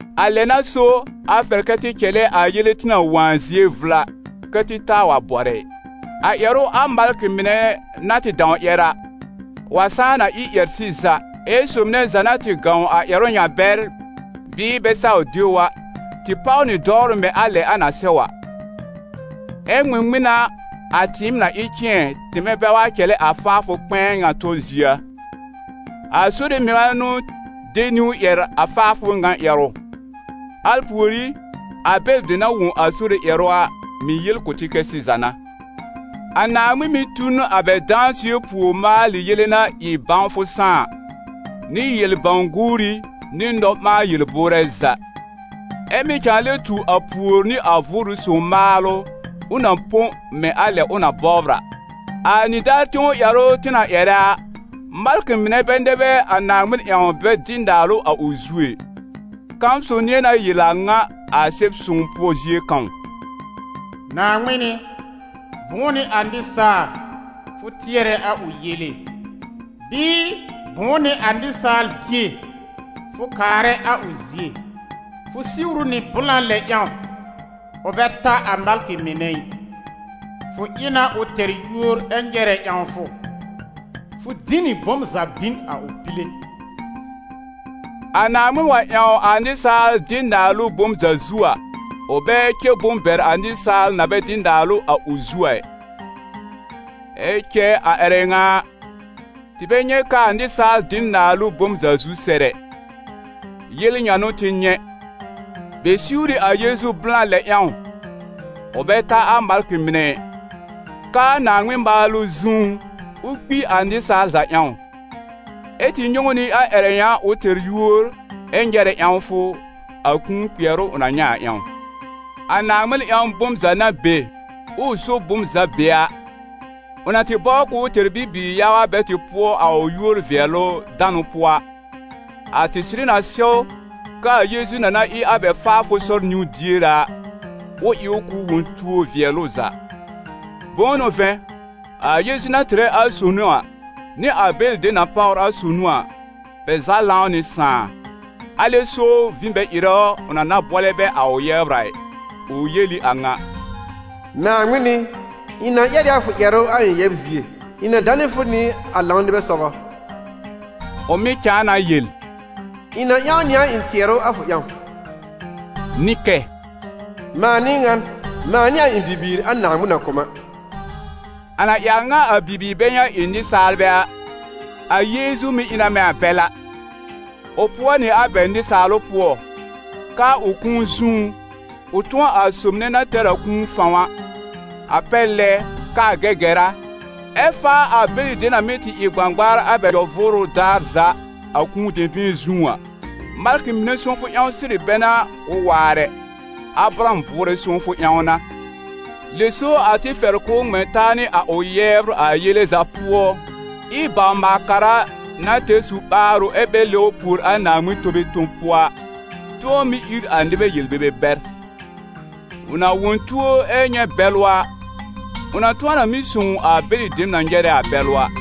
A lɛ n'a so, a fɛr kɛ tɩ cɛlɛ a yele tɩ na wõ a zie vla, kɛ̀ tɩ taa wa bɔrɛ ɩ. A ƴɛrʋ a malkɩ mɩnɛ na tɩ dãw ƴɛr a, wa sãá na ɩ ƴɛr-sɩza, ɛ sob nɛ za na tɩ gãw a ƴɛrʋ ŋa bɛr bɩɩ bɛ saw de ʋ a, tɩ páw nɩ dɔwrʋ mɛ̃ a lɛ a na sɛw a. Ɛ ŋmɩŋmɩn n'a a tɩɩm na ɩ cɩ̃ɛ, tɩmɛ bɛ wa cɛlɛ a faafʋ kpɛ̃ɛ ŋa tɔ zie a? A Sore mɩŋa n'ʋ de niwn ƴɛr a faafʋ ŋa ƴɛrʋ; al pùorí, a bɛlɩ dem na wõ a Sore ƴɛrʋ a, mɩ̀ yel kʋ̀ tɩ kɛ sɩza n'a. A Naaŋmɩn mɩ̀ tu n a bɛ dãsɩɛ pùor maalɩ yele na ɩ bãwfʋ sãá a, nɩ yel-bãw-guuri nɩ nɔ-ɓãa-yel-bʋʋrɛ za, ɛ mɩ̀ cãa lɛ tu a pùor nɩ a Vʋʋrʋ Sõw maalʋ ʋ na põ mɛ̃ a lɛ ʋ na bɔbr a. A nɩdaar tẽw ƴɛrʋ tɩ na ƴɛrɛ a, malkɩ mɩnɛ bɛ nɛ bɛ a Naaŋmɩn ƴãw bɛ dɩ naalʋ a ʋ zu ɛ. Kãw sob nɩ̃ɛ na yel a ŋa a Sɛb-sõw pʋɔ zie kãw: «Naaŋmɩn ɩ, bʋ̃ʋ n'ɩ a nɩsaal, fʋ tɩɛrɛ a ʋ yele? Bɩɩ, bʋ̃ʋ n'ɩ a nɩsaal-bie, fʋ kaarɛ a ʋ zie? Fʋ siwr ʋ nɩ blã lɛ ƴãw, ʋ bɛ ta a malkɩ mɩnɛ ɩ, fʋ ɩ na ʋ tɛr yúor ɛ nyɛrɛ ƴãwfʋ, fʋ dĩ nɩ bom za bin a ʋ pile.» A Naaŋmɩn wa ƴãw a nɩsaal dɩ naalʋ bom za zu a, ʋ bɛ cɛ bom bɛr a nɩsaal na bɛ dɩ naalʋ a ʋ zu a ɩ. Ɛ cɛ a ƴɛrɛ ŋa a, tɩ bɛ nyɛ̃ k'aa nɩsaal dɩ n naalʋ bom za zu sɛr ɛ. Yel ŋa n'ʋ tɩ nyɛ̃: bɛ siwr ɩ a Yeezu blã lɛ ƴãw, ʋ bɛ ta a malkɩ mɩnɛ ɩ, k'aa Naaŋmɩn maalʋ zũú, ʋ́ kpi a nɩsaal za ƴãw; ɛ́ tɩ nyɛ̃ ʋ nɩ ƴɛrɛ ŋa ʋ tɛr yúor ɛ nyɛrɛ ƴãwfʋ, a kũu kpɩɛrʋ ʋ na nyɛ̃ a ƴãw. A Naaŋmɩn ƴãw bom za na be, ʋʋ so bom za be a, ʋ na tɩ bɔbr k'ʋʋ tɛr bibiir yaga bɛ tɩ pʋɔ a ʋ yúor-vɩɛlʋ-danʋ pʋɔ a, a tɩ sɩrɩ na sɛw, k'aa Yeezu na na ɩ a bɛ faafʋ sɔr niwn-diere a, ʋ ɩ ʋ k'ʋ wõ tuo vɩɛl ʋ za. Bʋ̃ʋ n'ʋ vɛ̃, a Yeezu na tɩrɛ a sonu a, nɩ a bɛlɩ dem na páwr a sonu a, bɛ za lãw nɩ Sãà, alɛ so vĩ bɛ ɩrɛ ʋ, ʋ na na bʋɔlɛ bɛ a ʋ yɛbr a ɩ. Ʋ yel ɩ a ŋa: «Naaŋmɩn ɩ, ɩ̃ na ƴɛr ɩ a fʋ ƴɛrʋ a ɩ̃ yɛbr zie, ɩ̃ na danɩ fʋ nɩ a lãw nɩbɛ sɔgɔ.» Ʋ mɩ̀ cãa na yel: «Ɩ̃ na ƴãw nɩ a ɩ̃ tɩɛrʋ a fʋ ƴãw.» Nɩ kɛ: «Mãa n'ɩ ŋan, mãa nɩ a ɩ̃ bibiir a Naaŋmɩn na kʋ̀ m a.» A na ɩ a ŋa, a bibiir bɛ ŋa ɩ nɩsaalbɛ a, a Yeezu mɩ̀ ɩ na mɛ̃ a bɛl a, ʋ pʋɔ nɩ a bɛ nɩsaalʋ pʋɔ, k'aa ʋ kũu zũú, ʋ tʋ̃ɔ a sob nɛ na tɛr a kũu fãw a, a pɛr lɛ k'aa Gɛgɛra, ɛ faa a bɛlɩ dem na mɩ́ tɩ ɩ gbãgbaar a bɛ nyɔ-vʋʋrʋ daar za, a kũu dɛ̃bɩ̃ɛ zũú a. Malkɩ mɩnɛ sõwfʋ ƴãw sɩrɩ bɛ n'a ʋ waar ɛ, Abraham bʋʋrɛ sõwfʋ ƴãw n'a. Lɛ so a tɩ fɛr k'ʋʋ ŋmɛ̃ taa nɩ a ʋ yɛbr a yele za pʋɔ, ɩ bawr-maal-kara na tɛr su-ɓaarʋ ɛ bɛ lɛbr pùor a Naaŋmɩn tome tob pʋɔ a, tʋ̃ɔ mɩ́ ír a nɩbɛ yel-bebe bɛr. Ʋ na wõ tuo ɛ nyɛ̃ bɛlʋ a, ʋ na tʋ̃ɔ na mɩ́ sõw a bɛlɩ dem na nyɛrɛ a bɛlʋ a.